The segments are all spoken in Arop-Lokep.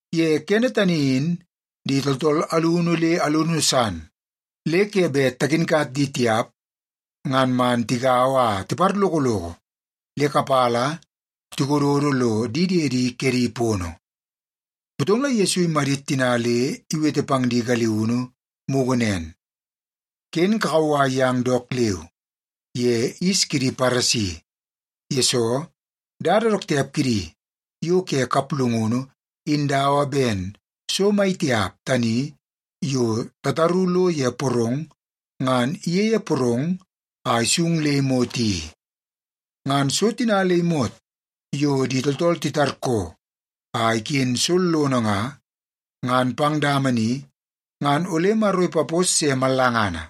Ye kene tani in di tooltool alunu le alunu san le ke bet takinkat di tiap ngan man tigaua a tiparlokoloko le kapala tikododo lo di diedi kedi pono. Motong la Yesu imadit tina le iwete pang di galiunu mugu nen, “Ken kakauwai yang dook leu ye yis kidi Paresi. Yesoo, dada dook tiap kidi yo ke kaplungunu in dawa ben so mai tiap tani yo tataru lo ye porong ngan iyeie porong a isung le imot i. Ngan so tina le imot yo di tooltool titarkoo a iken sollono nga, ngan pang dama ni ngan ole Maro ipapos se mallangana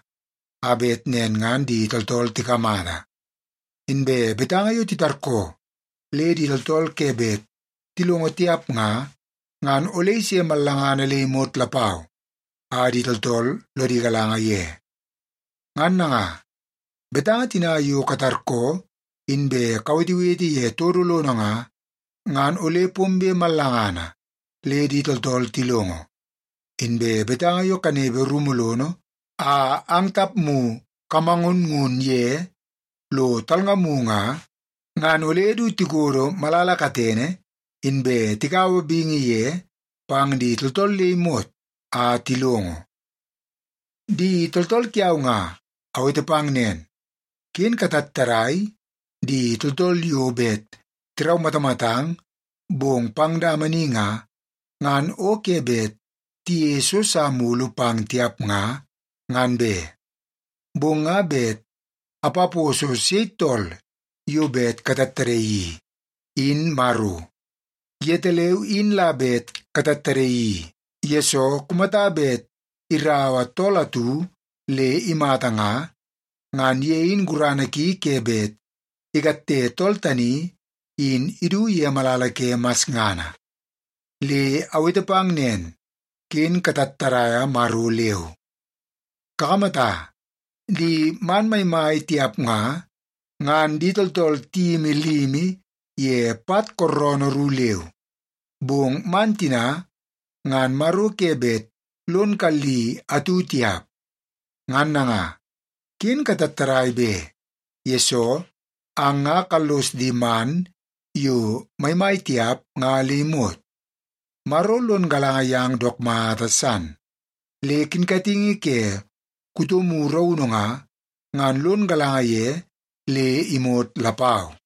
a bet nen ngan di tooltool tikamata. Inbe betanga yo titarkoo le di tooltool ke bet tilongo tiap nga, ngan ole ise mallangana le imot lapau a di tooltool lodi galanga ye. Ngan nanga, betanga tina yo katarkoo inbe kawetewete ye todo lono nga, ngan ole pombe mallangana le di tooltool tilongo. Inbe betanga yo kanepe rumu lono a ang tapmu kamangunngun ye lo talngamu nga, ngan ole du tikodo malala katene, inbe tikaua bingi ye pang di tooltool le imot a tilongo. “Di tooltool kiau nga, awete pang nen, ken katattadai di tooltool yo bet tiraumatamatang, bong pang dama ni nga, ngan o ke bet tiyeie so sa mulu pang tiap nga, ngan be. Bong nga bet apaposo sei tool yo bet katattadaii i, in Maro. Yetaleu in la bet katattadaii i, yesoo kumata bet iraua tool atu le imata nga, ngan ye in gurana ki ke bet ikatte tool tani, in idu ye malala ke masngana. Le awete pang nen, ken katattadaia Maro leu. Kakamata, di man maimai tiap nga, ngan di tooltool tiyimi limi ye pat kooroonoo ru leu. Bong man tina ngan Maro ke bet lon kalli atu tiap. Ngan nanga, ken katattadai be, yesoo ang nga kallos di man yo maimai tiap nga le imot. Maro lon galanga yang dook mata san, le kinkatingi ke kutomu raunu nga, ngan lon galanga ye le imot lapau.”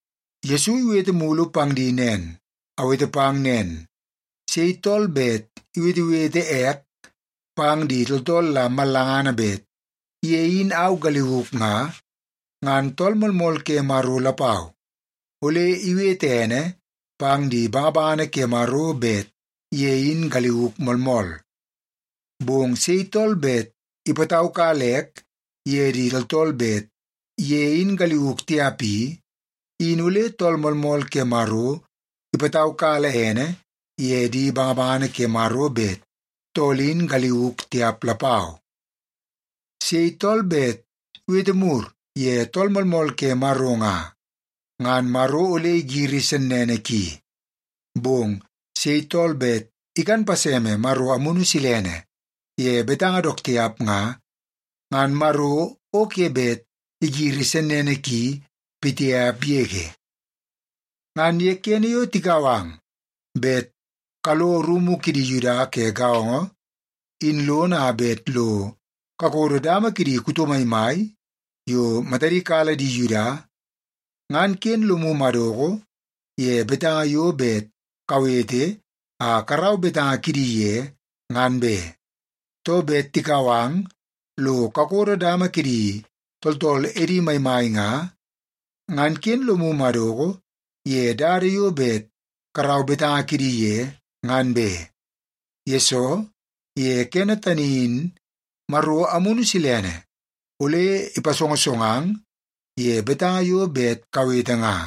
Yesu iwete mulu pang di nen, “Awete pang nen, sei tool bet iwetewete ek pang di tooltool la mallangana bet ye in au galiuk nga, ngan Tool Moolmool ke Maro lapau, ole iwete ene pang di bangabangana ke Maro bet ye in galiuk moolmool. Bong sei tool bet ipataukala ek ye di tooltool bet ye in galiuk tiap i, in ole Tool Moolmool ke Maro ipataukala ene ye di bangabangana ke Maro bet tool in galiuk tiap lapau. Sei tool bet iwete mur ye Tool Moolmool ke Maro nga, ngan Maro ole igiri sennene ki. Bong sei tool bet ikan paseme Maro Amunu Silene ye betanga dook tiap nga, ngan Maro o ke bet igiri sennene ki pitiap yege. “Ngan ye kene yo tikau ang bet kalo rumu kidi Yuda ke gaongo in lono a bet lo kakodo dama kidi kuto maimai yo matadi kala di Yuda, ngan ken lomu madoko ye betanga yo bet kawete a karau betanga kidi ye, ngan be. Too, bet tikau ang lo kakodo dama kidi tooltool edi maimai nga, ngan ken lomu madoko ye dada yo bet karau betanga kidi ye, ngan be. Yesoo ye kene tani in Maro Amunu Silene ole ipasongosongang ye betanga yo bet kawete nga.”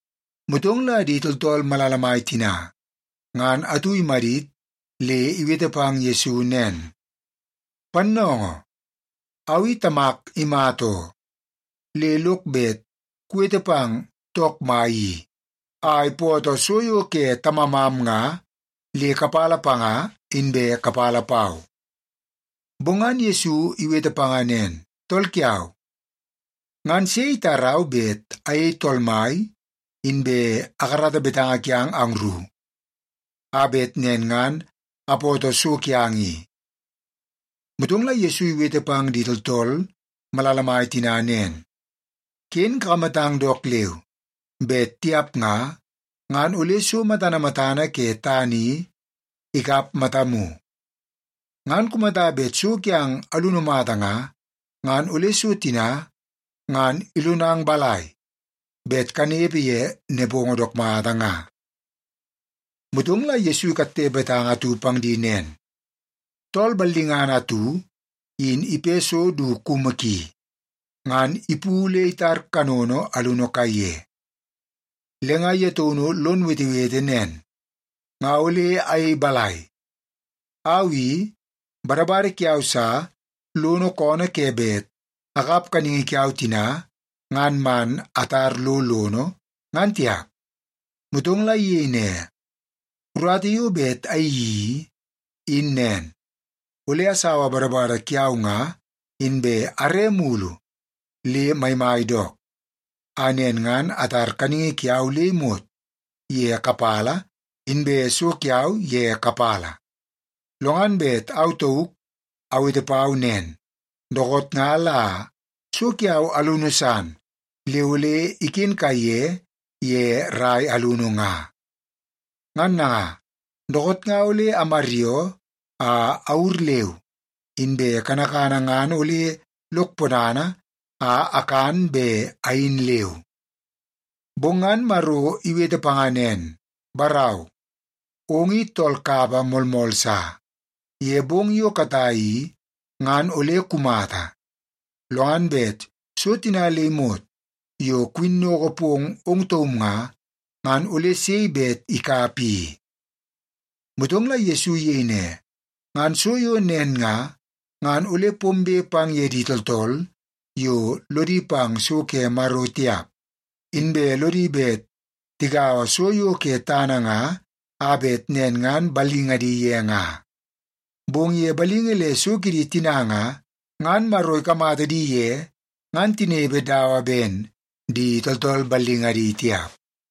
Motong la di tooltool malala mai tina, ngan atu imadit le iwete pang Yesu nen, “Pannoongoo, au i tamak imata oo. Le lok bet kuwete pang took mai i a ipoto so yo ke tamamam nga, le kapala panga, inbe kapala pau.” Bong ngan Yesu iwete panga nen, “Tool kiau, ngan sei itarau bet ayei tool mai, inbe akarata betanga kiang angru, a bet nen ngan apoto so kiang i?” Motong la Yesu iwete pang di tooltool malala mai tina nen, “Ken kakamatang dook leu! Bet tiap nga, ngan ole so matana matana ke tana i ikap matamu. Ngan kumata bet so kiang alunu mata nga, ngan ole so tina ngan ilonang balai bet kanepe ye nepongo dook mata nga?” Motong la Yesu ikatte betanga atu pang di nen, “Tool ballingana atu in ipe so du kumu ki, ngan ipu le itar kanono alunu kaiye. Le nga ye taunu lon wetewete nen, ‘Nga ole ayei balai? Au i, badabada kiau sa lono koonoo ke bet akap kaningi kiau tina ngan man atar lo lono, ngan tiap.’ Motong la iyei ne, ‘Urata yo bet ayeii i, in nen. Ole asaua badabada kiau nga, inbe are mulu le maimai dook, a nen ngan atar kaningi kiau le imot ye kapala, inbe so kiau ye kapala. Lo ngan bet au tauk awete pau nen, “Dookoot nga la so kiau alunu san le ole iken kaiye ye rai alunu nga. Ngan nanga, dookoot nga ole amaryoo a awur leu, inbe kanakana ngan ole lok ponana a akan be ayin leu.” ’ “Bong ngan Maro iwete panga nen, ‘Barau, ong i tool kapa moolmool sa. Ye bong yo katai i, ngan ole kumata. Lo ngan bet so tina le imot yo kuwinnoko pong ong taum nga, ngan ole sei bet ikap i?’” Motong la Yesu iyei ne, “Ngan so yo nen nga, ngan ole pombe pang ye di tooltool yo lodi pang so ke Maro tiap, inbe lodi bet tigaua so yo ke tana nga a bet nen ngan ballingadi ye nga. Bong ye balingi le so kidi tina nga, ngan Maro ikamata di ye ngan tinepe dawa ben di tooltool ballingadi tiap.”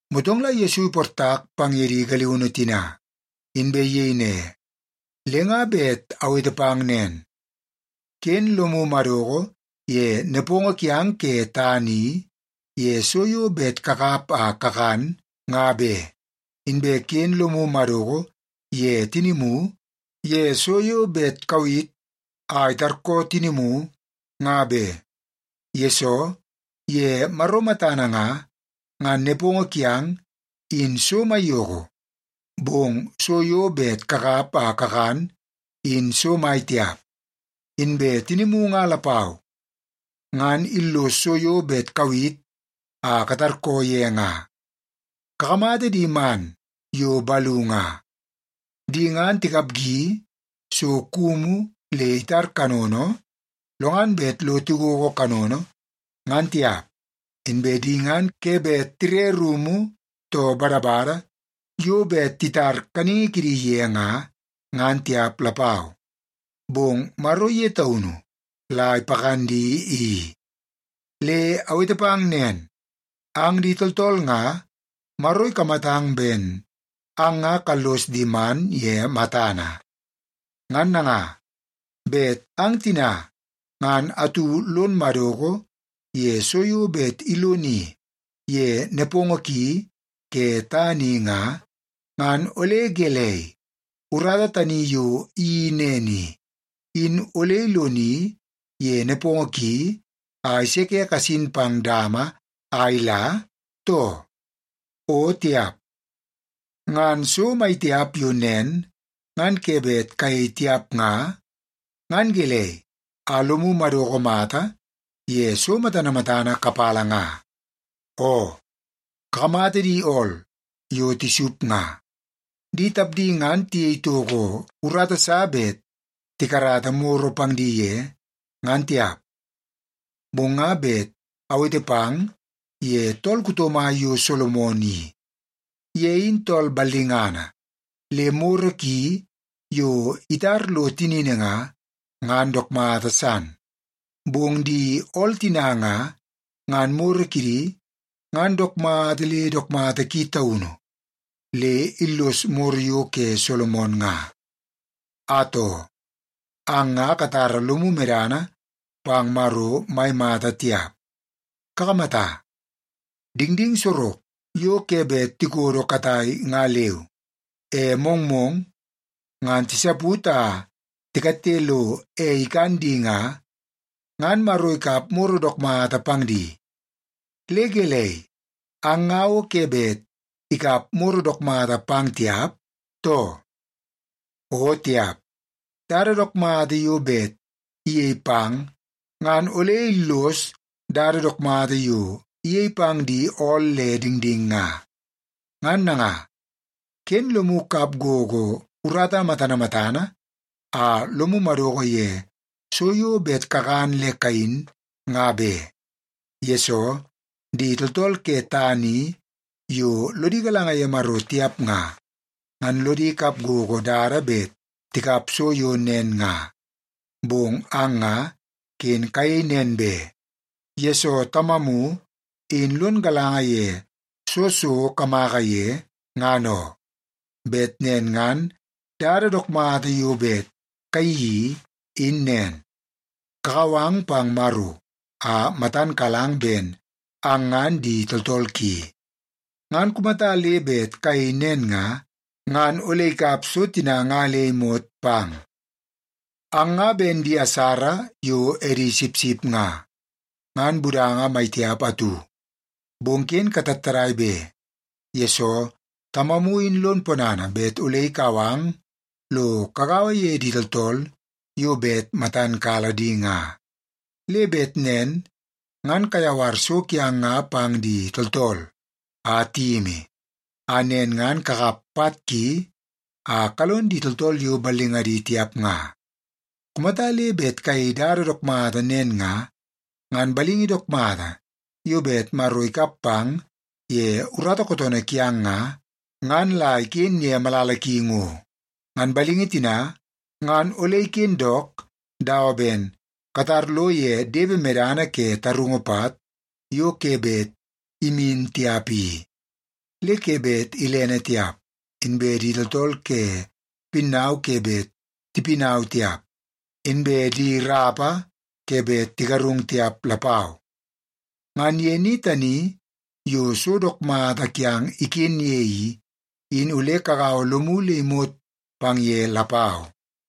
Motong la Yesu iportak pang ye di galiunu tina, inbe iyei ne, “Le nga bet awete pang nen, ken lomu madoko ye nepongo kiang ke tana i, ye so yo bet kakap a kakan, nga be. Inbe ken lomu madoko ye tinimu ye so yo bet kawit a itarkoo tinimu, nga be. Yesoo, ye Maro matana nga, ngan nepongo kiang, in so maiyoko, bong so yo bet kakap a kakan, in so mai tiap. Inbe tinimu nga lapau, ngan illoso so yo bet kawit a katarkoo ye nga. Kakamata di man yo balu nga. Di ngan tikapgi so kumu le itar kanono, lo ngan bet lo tigogo kanono, ngan tiap. Inbe di ngan ke bet tire rumu too badabada yo bet titar kaningi kidi ye nga, ngan tiap lapau. Bong Maro ye taunu la ipakan di i. Le awete pang nen, ang di tooltool nga, Maro ikamatang ben ang nga kallos di man ye matana. Ngan nanga, bet ang tina ngan atu lon madoko ye so yo bet iloni ye nepongo ki ke tana i nga, ngan ole gelei, urata tani yo iyeii nen i, in ole iloni ye nepongo ki a iseke kasin pang dama a ila, too? O tiap! Ngan so maitiap yo nen ngan ke bet kayei tiap nga, ngan gelei a lomu madoko mata ye so matana matana kapala nga? “Oo, kakamata di ool yo tisup nga. Di tapdi ngan tiyei toko urata sa bet tikarata moro pang di ye, ngan tiap. Bong nga bet awete pang ye tool kuto mai yo Solomon i. Ye in tool ballingana, le moro ki yo itar lo tinini nga, ngan dook mata san. Bong di ool tina nga, ngan moro kidi ngan dook mata le dook mata ki taunu le illos moro yo ke Solomon nga. Atoo, ang nga katara lomu medana pang Maro mai mata tiap. Kakamata, dingding sorok yo ke bet tikodo katai nga leu, e mongmong ngan tisaput a tikatte lo ei ikan di nga, ngan Maro ikap moro dook mata pang di. Le gelei, ang nga o ke bet ikap moro dook mata pang tiap, too? O tiap! Dada dook mata yo bet iyei pang ngan ole illos dada dook mata yo iyei pang di ool le dingding nga. Ngan nanga, ken lomu kap gogo urata matana matana a lomu madoko ye so yo bet kakan le kayin nga be. Yesoo, di tooltool ke tana i yo lodi galanga ye Maro tiap nga, ngan lodi kap gogo dada bet tikap so yo nen nga. Bong ang nga ken kayei nen be, yesoo Tamamu in lon galanga ye soo so kamaka ye, ngan oo. Bet nen ngan dada dook mata yo bet kayeii i, in nen. Kakau ang pang Maro a matan kalang ben ang ngan di tooltool ki. Ngan kumata le bet kayei nen nga, ngan ole ikap so tina nga le imot pang. “Ang nga ben di asara yo edi sipsip nga, ngan budanga maitiap atu. Bong ken katattadai be, yesoo Tamamu in lon ponana bet ole ikau ang lo kagaua ye di tooltool yo bet matan kala di nga. Le bet nen ngan kayawar so kiang nga pang di tooltool a tiyimi, a nen ngan kakap pat ki a kalon di tooltool yo ballingadi tiap nga. Kumata le bet kayei dada dook mata nen nga, ngan balingi dook mata yo bet Maro ikap pang ye urata kootoonoo kiang nga, ngan la iken ye malala ki ngo. Ngan balingi tina, ngan ole iken dook dawa ben katar lo ye depe medana ke tarungu pat yo ke bet imin tiap i. Le ke bet ilene tiap, inbe di tooltool ke pinnau ke bet tipinau tiap, inbe di rapa ke bet tigarungu tiap lapau. Ngan ye ni tani yo so dook mata kiang iken ye i, in ole kagaua lomu le imot pang ye lapau.”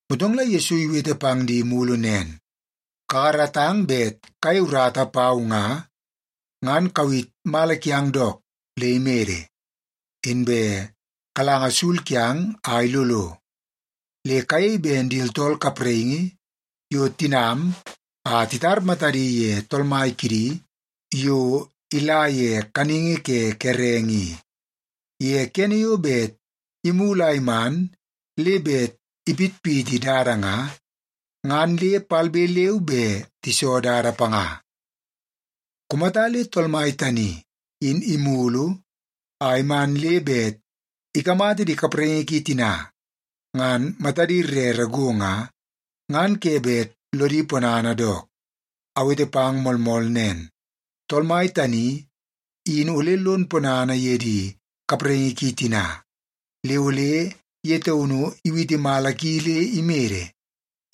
Motong la Yesu iwete pang di mulu nen, “Kakaratang bet kayei urata pau nga, ngan kawit mala kiang dook le imede, inbe kalanga sul kiang a ilolo. Le kayei ben di tooltool kapraingi yo tinam a titar matadi ye tool mai kidi yo ila ye kaningi ke kerenge i. Ye kene yo bet imulu a iman le bet ipitpiti dada nga, ngan le palbe leu be tiso dada panga. Kumata le tool mai tani in imulu a iman le bet ikamata di kapraingi ki tina ngan matadi rere go nga, ngan ke bet lodi ponana dook. Awete pang moolmool nen, tool mai tani in ole lon ponana ye di kapraingi ki tina, le ole ye taunu iwiti mala ki le imede,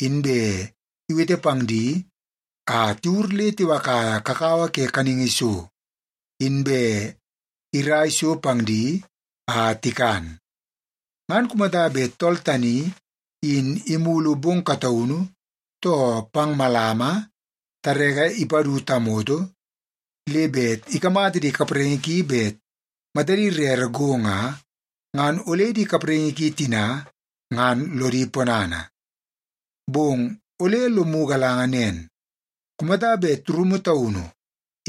inbe iwete pang di a tiwur le tiwakaia kakawa ke kaningi so, inbe irai so pang di a tikan. Ngan kumata bet tool tani in imulu bong kataunu, too pang malama tareke ipadu tamoto, le bet ikamata di kapraingi ki bet matadi rere go nga, ngan ole di kapraingi ki tina ngan lodi ponana. Bong ole lomu galanga nen. Kumata bet rumu taunu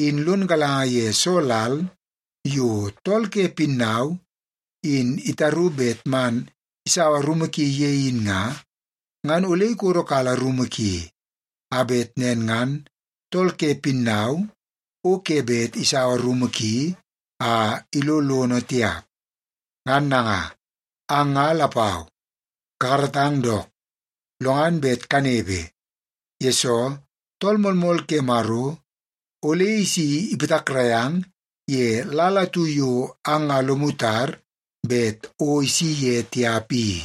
in lon galanga ye soo lal yo tool ke pinnau in itaru bet man isaua rumu ki ye in nga, ngan ole ikodokala rumu ki, a bet nen ngan tool ke pinnau o ke bet isaua rumu ki a ilo lono tiap. Ngan nanga, ang nga lapau kakaratang dook, lo ngan bet kanepe, yesoo Tool Moolmool ke Maro ole isi ipatakrai ang ye lal atu yo ang nga lomu tar bet o isi ye tiap i.”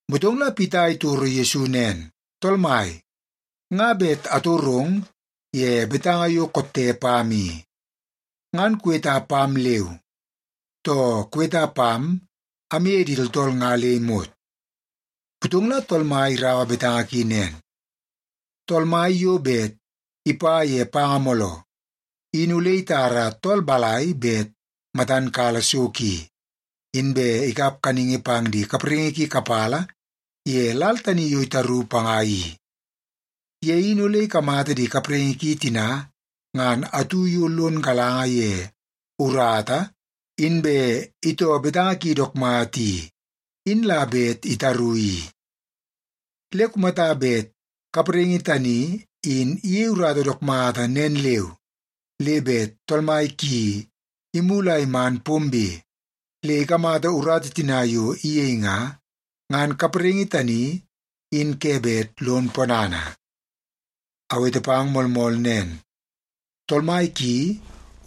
Motong Pita itoro Yesu nen, “Tool Mai, nga bet atorong ye betanga yo kotte pam i. Ngan kuweta pam leu, too kuweta pam amye di tooltool nga le imot?” Motong la Tool Mai iraua betanga ki nen, “Tool mai yo bet ipa ye panga mooloo, in ole itara tool balai bet matan kala so ki, inbe ikap kaningi pang di kapraingi ki kapala ye lal tani yo itaru panga i? Ye in ole ikamata di kapraingi ki tina ngan atu yo lon galanga ye urata inbe itoo betanga ki dook mata i, in la bet itaru i. Le kumata bet kapraingi tani in iyei urata dook mata nen leu, le bet tool mai ki imulu a iman pombe le ikamata urata tina yo iyei nga, ngan kapraingi tani in ke bet lon ponana. Awete pang moolmool nen, tool mai ki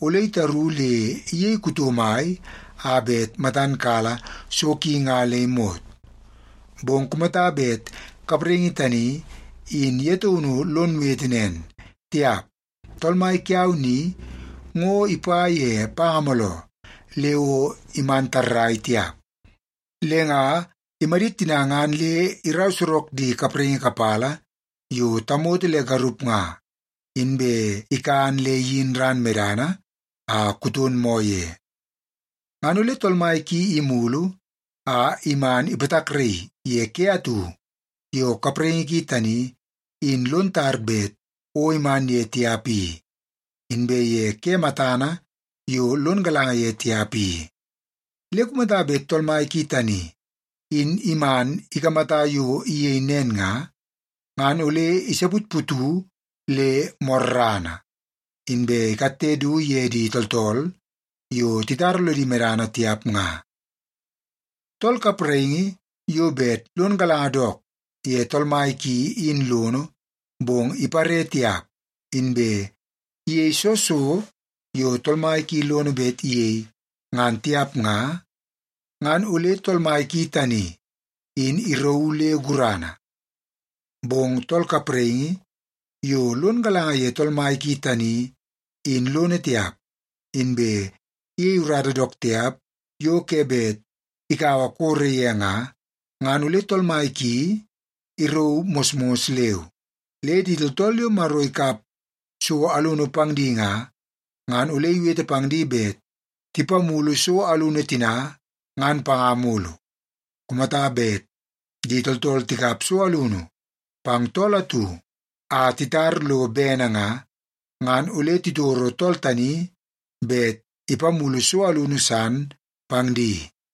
ole itaru le iyei kuto mai a bet matan kala so ki nga le imot. Bong kumata bet kapraingi tani in ye taunu lon wete nen, ‘Tiap. Tool mai kiau ni ngo ipa ye panga mooloo le o iman tarrai tiap,’ le nga imadit tina ngan le irau sorok di kapraingi kapala yo tamoto le garup nga, inbe ikan le iyin ran medana a kuton moo ye. Ngan ole tool mai ki imulu a iman ipatakraii ye ke atu yo kapraingi ki tani in lon tar bet o iman ye tiap i, inbe ye ke matana yo lon galanga ye tiap i. Le kumata bet tool mai ki tani in iman ikamata yo iyei nen nga, ngan ole isaputputu le morrana, inbe ikatte du ye di tooltool yo titara lodi medana tiap nga. “Tool kapraingi yo bet lon galanga dook ye tool mai ki in lono, bong ipare tiap, inbe iyei soo so yo tool mai ki lono bet iyei, ngan tiap nga, ngan ole tool mai ki tani in irauu le gurana. Bong tool kapraingi yo lon galanga ye tool mai ki tani in lono tiap, inbe iyei urata dook tiap yo ke bet ikaua koro ye nga, ngan ole tool mai ki irauu mosmos leu. Le di tooltool yo Maro ikap so alunu pang di nga, ngan ole iwete pang di bet tipamulu so alunu tina ngan panga mulu. Kumata bet di tooltool tikap so alunu pang tool atu a titar lo bene nga, ngan ole titoro tool tani bet ipamulu so alunu san pang di.”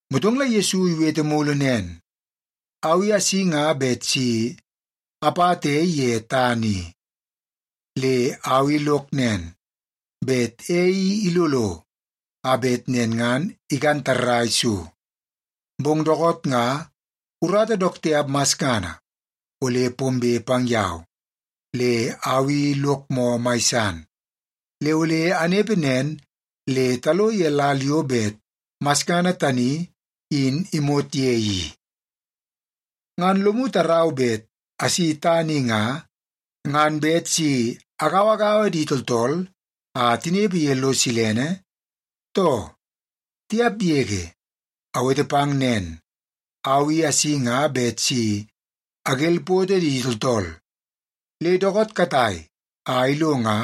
Motong la Yesu iwete mulu nen, “Au i asi nga bet si apata ei ye tana i. Le au i lok nen, bet ei i ilolo a bet nen ngan ikan tarrai so. Bong dookoot nga urata dook tiap masngana ole pombe pang yau, le au i lok moo mai san, le ole anepe nen le talo ye lal yo bet masngana tani in imot ye i. Ngan lomu tarau bet asi tana i nga, ngan bet si agauagaua di tooltool a tinepe ye lo silene, too? Tiap yege! Awete pang nen, au i asi nga bet si agelpoto di tooltool. Le dookoot katai a ilo nga,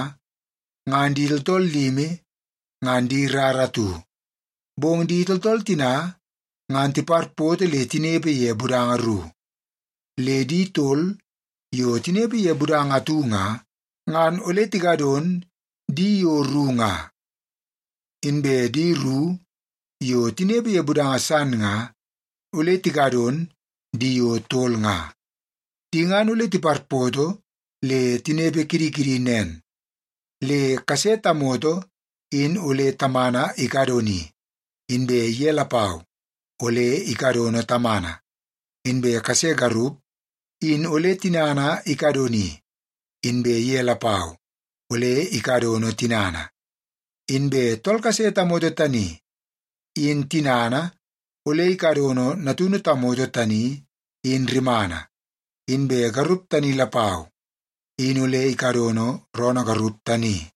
ngan di tooltool limi ngan di rara atu, bong di tooltool tina ngan tiparpoto le tinepe ye budanga ru. Le di tol yo tinepe ye budanga atu nga, ngan ole tikadon di yo ru nga. Inbe di ru yo tinepe ye budanga san nga, ole tikadon di yo tol nga. Di ngan ole tiparpoto le tinepe kidi kidi nen, le kase tamoto in ole tamana ikadoni, inbe ye lapau ole ikadono tamana. Inbe kase garup in ole tinana ikadoni, inbe ye lapau ole ikadono tinana. Inbe tool kase tamoto tani in tinana ole ikadono natunu tamoto tani in rimana, inbe garup tani lapau, in ole ikadono roonoo garup tani.”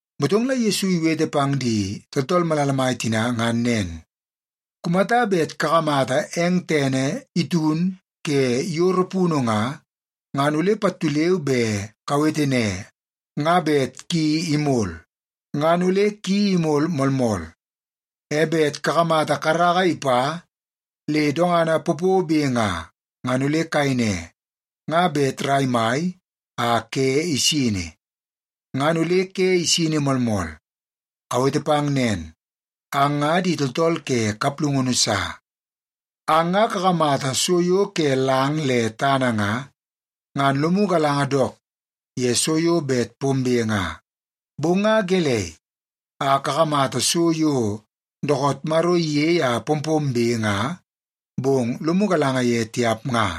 Motong la Yesu iwete pang di tooltool malala mai tina ngan nen, “Kumata bet kakamata eng tene itun ke yoro punu nga, ngan ole pattu leu be kawete ne, ‘Nga bet ki imol.’ Ngan ole ki imol moolmool. E bet kakamata karaka ipa le dongana popobe nga, ngan ole kayei ne, ‘Nga bet rai mai a ke isini.’ Ngan ole ke isini moolmool. Awete pang nen, ang nga di tooltool ke kaplungunu sa. Ang nga kakamata so yo ke lang le tana nga, ngan lomu galanga dook ye so yo bet pombe nga, bong nga gelei a kakamata so yo dookoot Maro iyei a pompombe nga, bong lomu galanga ye tiap nga?”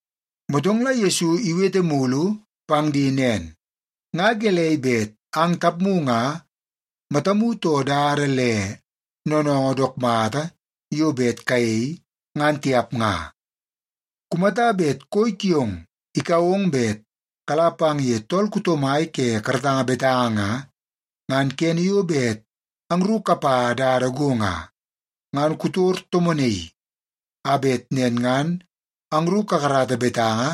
Motong la Yesu iwete mulu pang di nen, “Nga gelei bet ang tapmu nga matamu too dada le noonoongoo dook mata yo bet kayei, ngan tiap nga? Kumata bet koi kiong ikau ong bet kala pang ye tool kuto mai ke karatanga betanga nga, ngan kene yo bet angru kapa dada go nga, ngan kutor tomonaii a bet nen ngan angru kakarata betanga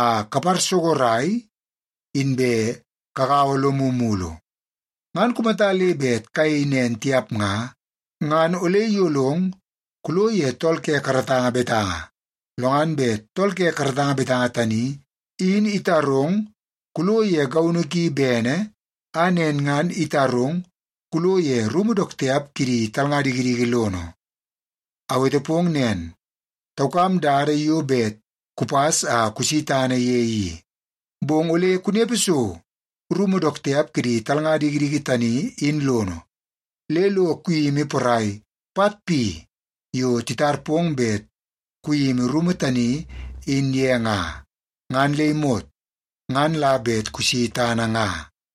a kaparsogorai inbe kagau lomu mulu. Ngan kumata le bet kuyei nen tiap nga, ngan ole iyolong kulo ye tool ke karatanga betanga, lo ngan bet tool ke karatanga betanga tani in itarong kulo ye gaunu ki bene, a nen ngan itarong kulo ye rumu dook tiap kidi talnga dikidiki lono. Awete pong nen, taukam dada yo bet kupas a kusi tana ye i. Bong ole kunepe so rumu dook tiap kidi talnga dikidiki tani in lono, le lo kuyimi porai pat pi yo titar pong bet kuyimi rumu tani in ye nga, ngan le imot, ngan la bet kusi tana nga.”